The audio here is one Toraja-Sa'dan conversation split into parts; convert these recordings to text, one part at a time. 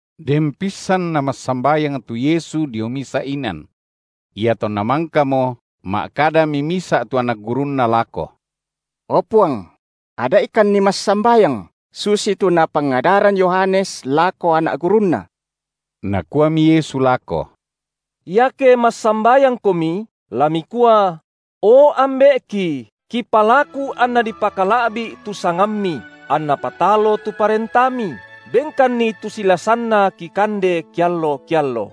Den pissan Namassambayang tu Yesu dio misa’ inan. Iatonna mangkamo, ma’kadami misa’ tu anak gurunNa lako: O Puang! ada’ikanni massambayang, susitu napangadaran Yohanes lako anak gurunna. Nakuami Yesu lako: Iake massambayangkomi, la mikua: O Ambe’ki, kipalaku anna dipakala’bi’ tu sangamMi, anna patalo tu ParentaMi, Benkanni tu silasanna kikande keallo-keallo.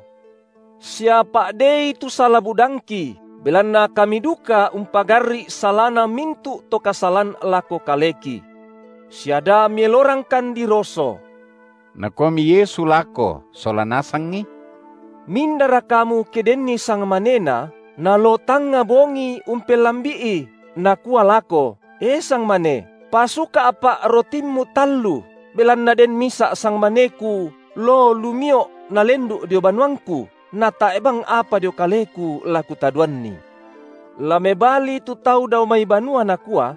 Sia pa’dei tu sala-budangki, belanna kami duka umpagarri’ salana mintu’ to kasalan lako kaleki. Sia da Mielorangkan diroso. Nakuami Yesu lako sola nasangi: Mindara kamu ke denni sangmanena, naloo tangnga bongi umpellambi’i, nakua lako: E sangmane, pasuka’pa’ rotimmu tallu, belanna den misa’ sangmaneku loo lumio’ nalendu’ dio banuangku, natae’ bang apa dio kaleku la kutadoanni. La mebali tu tau dao mai banua nakua: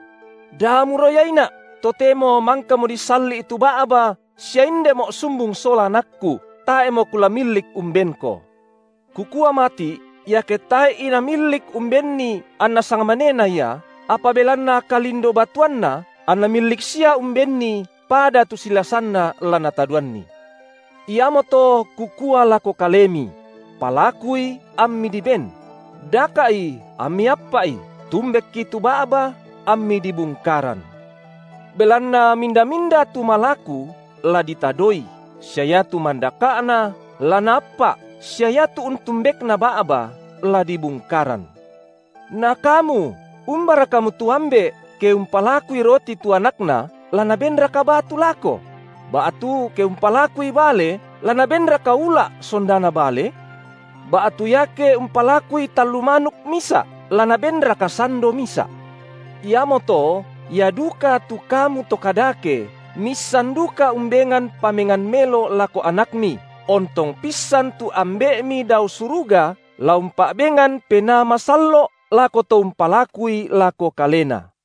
Da muroyaina’, totemo mangkamo disalli’ tu ba’ba sia indemo’ sumbung sola anakku, tae’mo kula millik umbenko. Kukua mati’, iake tae’i namillik umbenni anna sangmanena ia, apa belanna kalindo-batuanna, anna millik sia umbenni pada tu silasanna la natadoanni. Iamoto Kukua lako kalemi: Palakui ammi diben; daka’i ammi appa’i, tumbekki tu ba’ba ammi dibungkaran. Belanna minda-minda tu malaku, la ditadoi, sia iatu mandaka’na, la naappa’, sia iatu untumbekna ba’ba, la dibungkaran. Na kamu umbara kamu tu ambe’, ke umpalakui roti tu anakna, la nabenraka batu lako?, ba’tu, ke umpalakui bale, la nabenraka ula’ sondana bale? Ba’tu iake umpalakui tallu manuk misa’, la nabenraka sando misa’? Iamoto ia duka tu kamu to kadake, miissan duka umbengan pamengan melo lako anakmi, ontong pissan tu Ambe’mi dao suruga la umpa’bengan Penaa Masallo’ lako to umpalakui lako Kalena.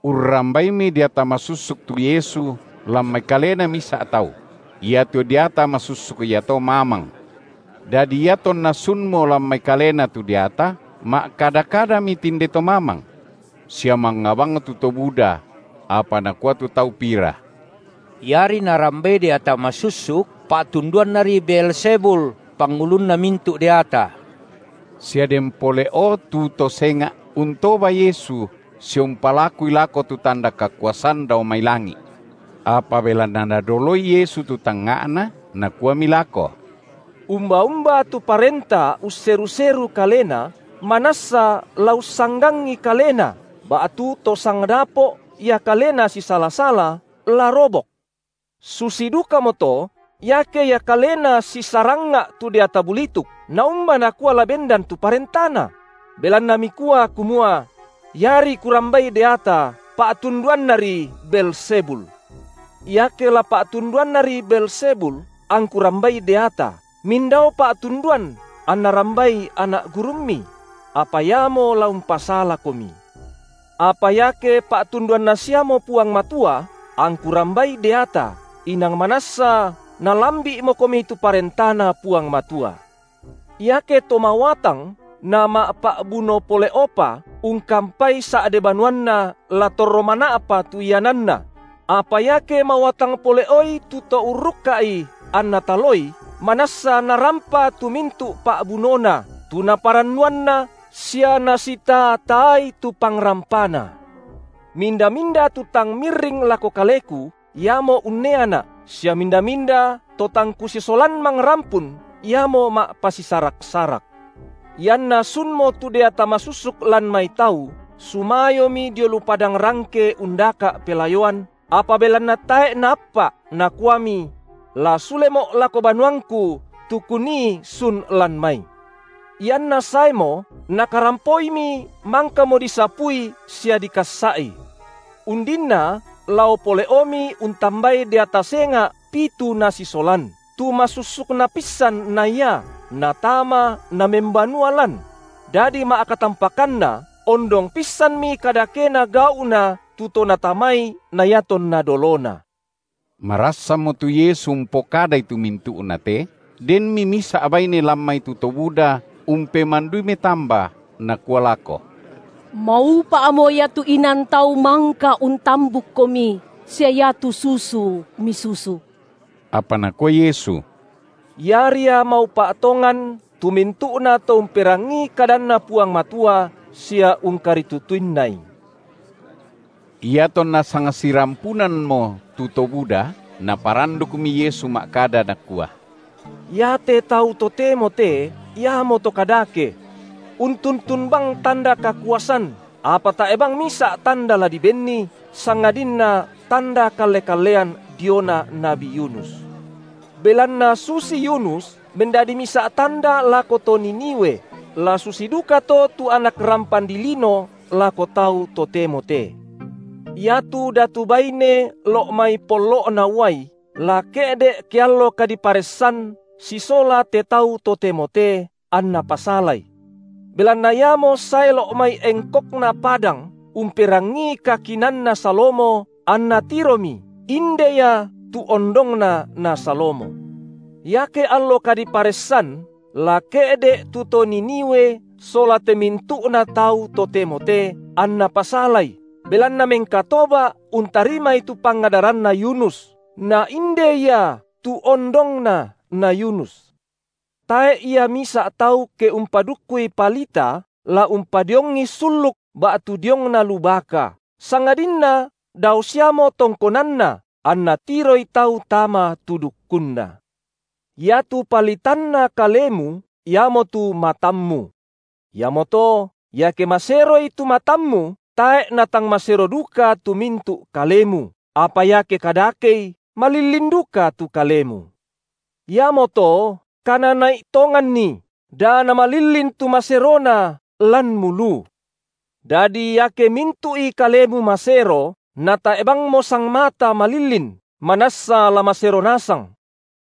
Urrambaimi deata masussuk tu Yesu lan mai kalena misa’ tau: iatu deata masussuk iato mamang. Dadi iatonna sunmo lan mai kalena tu deata, ma’kada-kadami tinde to mamang. Sia mangnga bang tu to buda; apa nakua tu tau pira: Iari Narambai deata masussuk, pa’tunduannari Beelzebul, pangulunna mintu’ deata. Sia den pole’o tu to senga’, untoba Yesu sia umpalakui lako tu tanda kakuasan dao mai langi’. Apa belanna Nadoloi Yesu tu tangnga’na, Nakuami lako: Umba-umba tu parenta usseru-seru kalena, manassa la ussanggangi kalena ba’tu to sangdapo’ ia kalena sisala-sala, la robok. Susi dukamoto, iake ia kalena sisarangnga’ tu deata bulituk, naumba nakua la bendan tu parentana? – belanna mikua kumua: iari Kurambai deata, pa’tunduannari Beelzebul. Iake la pa’tunduannari Beelzebul, angKu rambai deata, mindao pa’tunduan, anna rambai anak gurummi? Apa iamo la umpasalakomi. Apa iake pa’tunduanna siamo Puang Matua, angKu rambai deata, inang manassa nalambi’mokomi tu ParentaNa Puang Matua. Iake to mawatang nama’pa’buno pole’opa, ungkampai sa’de banuanna la torro mana’pa tu iananna; apa iake mawatang pole’oi tu to urrukka’i anna taloi, manassa narampa tu mintu’ pa’bunona, tu naparannuanna, sia nasitaa-taai tu pangrampana. Minda-minda tu tang mirring lako Kaleku, iamo unneaNa’ sia minda-minda to tang Kusisolan mangrampun, iamo ma’pasisarak-sarak. Ianna sunmo tu deata masussuk lan mai tau, sumayomi dio lu padang rangke undaka’ pelayoan, apa belanna tae’ naappa’, nakuami: La sulemo’ lako banuangku, tu kunii sun lan mai. Ianna saemo, nakarampoimi mangkamo disapui sia dikassa’i. Undinna lao pole’omi untambai deata senga’ pitu nasisolan, tu masussukna pissan na ia, natama namembanua lan; dadi ma’katampakanna ondong pissanmi kadakena gau’na tu to natamai na iatonna dolona. Marassanmo tu Yesu umpokadai tu mintu’na te, denmi misa’ baine lan mai tu to buda umpemandui metamba, nakua lako: Maupa’mo ia tu inan tau mangka untambukKomi sia iatu susu Misusu. Apa Nakua Yesu: Ia ria maupa’ tongan tu mintu’nato umperangii kadanNa Puang Matua sia ungkaritutuinnai. Iatonna sangsirampunammo tu to buda, naparandukmi Yesu ma’kada, Nakua: Iate tau totemo te iamoto kadake. Untuntun bang tanda kakuasan, apa tae’ bang misa’ tanda la dibenni, sangadinna tanda kalle-kallean diona nabi Yunus. Belanna susi Yunus mendadi misa’ tanda lako to Niniwe, la susi dukato tu Anak rampan dilino lako tau totemo te. Iatu datu baine lo’ mai pollo’na uai la ke’de’ ke allo kadiparessan sisola te tau totemo te anna pasalai. Belanna iamo sae lo’ mai engkokna padang umperangii kakinaanna Salomo anna tiromi, inde Ia tu ondongna na Salomo. Iake allo kadiparessan, la ke’de’ tu to Niniwe sola te mintu’na tau totemo te, anna pasalai, belanna mengkatoba’ untarimai tu pangadaranna Yunus na inde Ia tu ondongna na Yunus. Tae’ ia misa’ tau ke umpadukkui palita, la umpadiongi sulluk ba’tu diongna lu baka, sangadinna dao siamo tongkonanna, anna tiroi tau tama tu dukkunna. Iatu palitanna kalemu, iamotu matammu. Iamoto iake maseroi tu matammu, tae’ natang masero duka tu mintu’ kalemu, apa iake kadakei, malillin duka tu kalemu. Iamoto kanana’i tonganni, da namalillin tu maserona lanmu lu. Dadi iake mintu’i kalemu masero, natae’ bangmo sangmata malillin, manassa la masero nasang: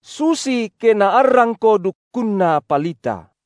susi ke naarrangko dukkunna palita.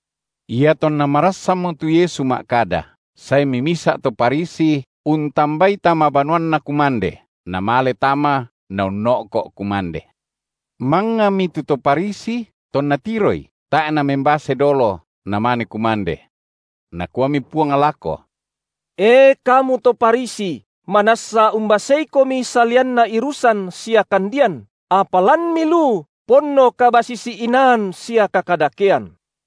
Iatonna marassanmo tu Yesu ma’kada, saemi misa’ to Farisi untambai tama banuanna kumande, Namale tama Naunno’ko’ kumande. Mangngami tu to Farisi, tonna tiroi, tae’ Namembase dolo, Namane kumande. Nakuami Puang lako: E, kamu to Farisi, manassa umbaseikomi salianna irusan, sia kandian, apa lanmi lu ponno kabasisi-inaan sia kakadakean.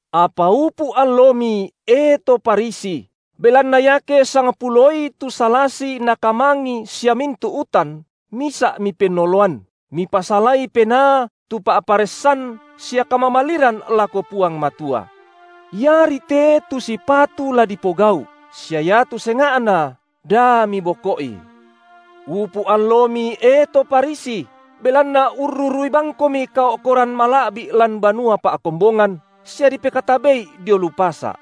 Apa upu’ allomi, e to Farisi, belanna iake sangpuloi tu salasi na kamangi sia mintu’ utan, misa’ mipennoloan, mipasalai penaa tu pa’paressan sia kamamaliran lako Puang Matua. Iari te tu sipatu la dipogau’, sia iatu senga’na da miboko’i. Upu’ allomi, e to Farisi, belanna urrurui bangkomi kao’koran mala’bi’ lan banua pa’kombongan sia dipekatabe’i dio lu pasa’.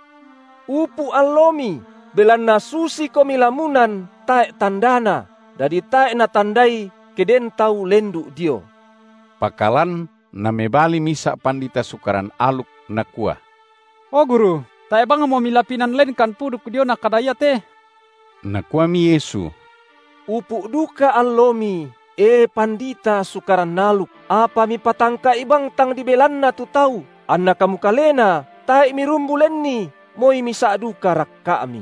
Upu’ allomi, belanna susikomi lamunan tae’ tandana, dadi tae’ natandai, ke den tau lendu’ dio. Pakalan namebali misa’ pandita Sukaran aluk, nakua: O Guru, tae’ bangmo Milapinan lenkan puduk diona kada iate. Nakuami Yesu: Upu’ duka allomi, e pandita Sukaran aluk! apa mipatangka’i bang tang dibelanna tu tau, anna kamu kalena tae’ mirumbu lenni moi misa’ duka rakka’mi.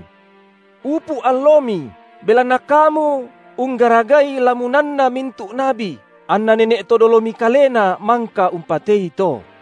Upu’ allomi, belanna kamu unggaragai lamunanna mintu’ nabi, anna nene’ to dolomi kalena mangka umpatei to.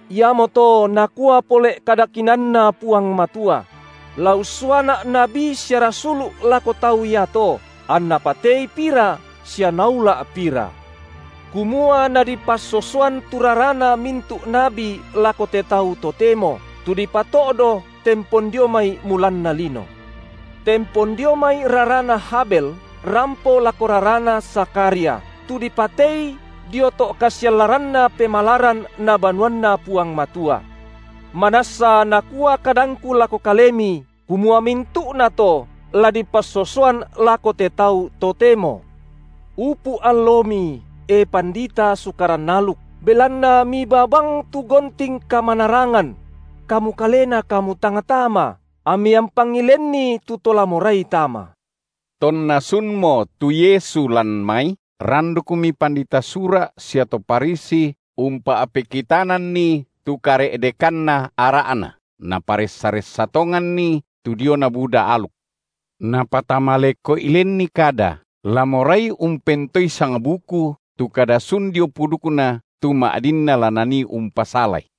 Iamoto nakua pole’ kada kinaanNa Puang Matua: La ussuaNa’ nabi sia rasulu’ lako tau iato, anna patei pira sia naula’ pira; kumua nadipassosoan tu rarana mintu’ nabi lako te tau totemo, tu dipato’do tempon dio mai mulanna lino; tempon dio mai rarana Habel rampo lako rarana Zakharia, tu dipatei dio to’ kasiallaranna pemalaran na banuanNa Puang Matua. Manassa nakua kadangKu lako kalemi, kumua mintu’nato, la dipassosoan lako te tau totemo. Upu’ allomi, e pandita Sukaran aluk, belanna mibaa bang tu gonting kamanarangan; kamu kalena kamu tang tama, ammi ampangi lenni tu to la morai tama. Tonna sunmo tu Yesu lan mai, randukmi pandita Sura’ sia to Farisi umpa’pekitananNi tu kare’dekanna ara’na, naparessa-ressa tonganNi tu diona buda aluk; napatama leko’i lenni kada, la morai umpentoei sangbuku tu kada sun dio pudukNa tu ma’dinna la nanii umpasalaI.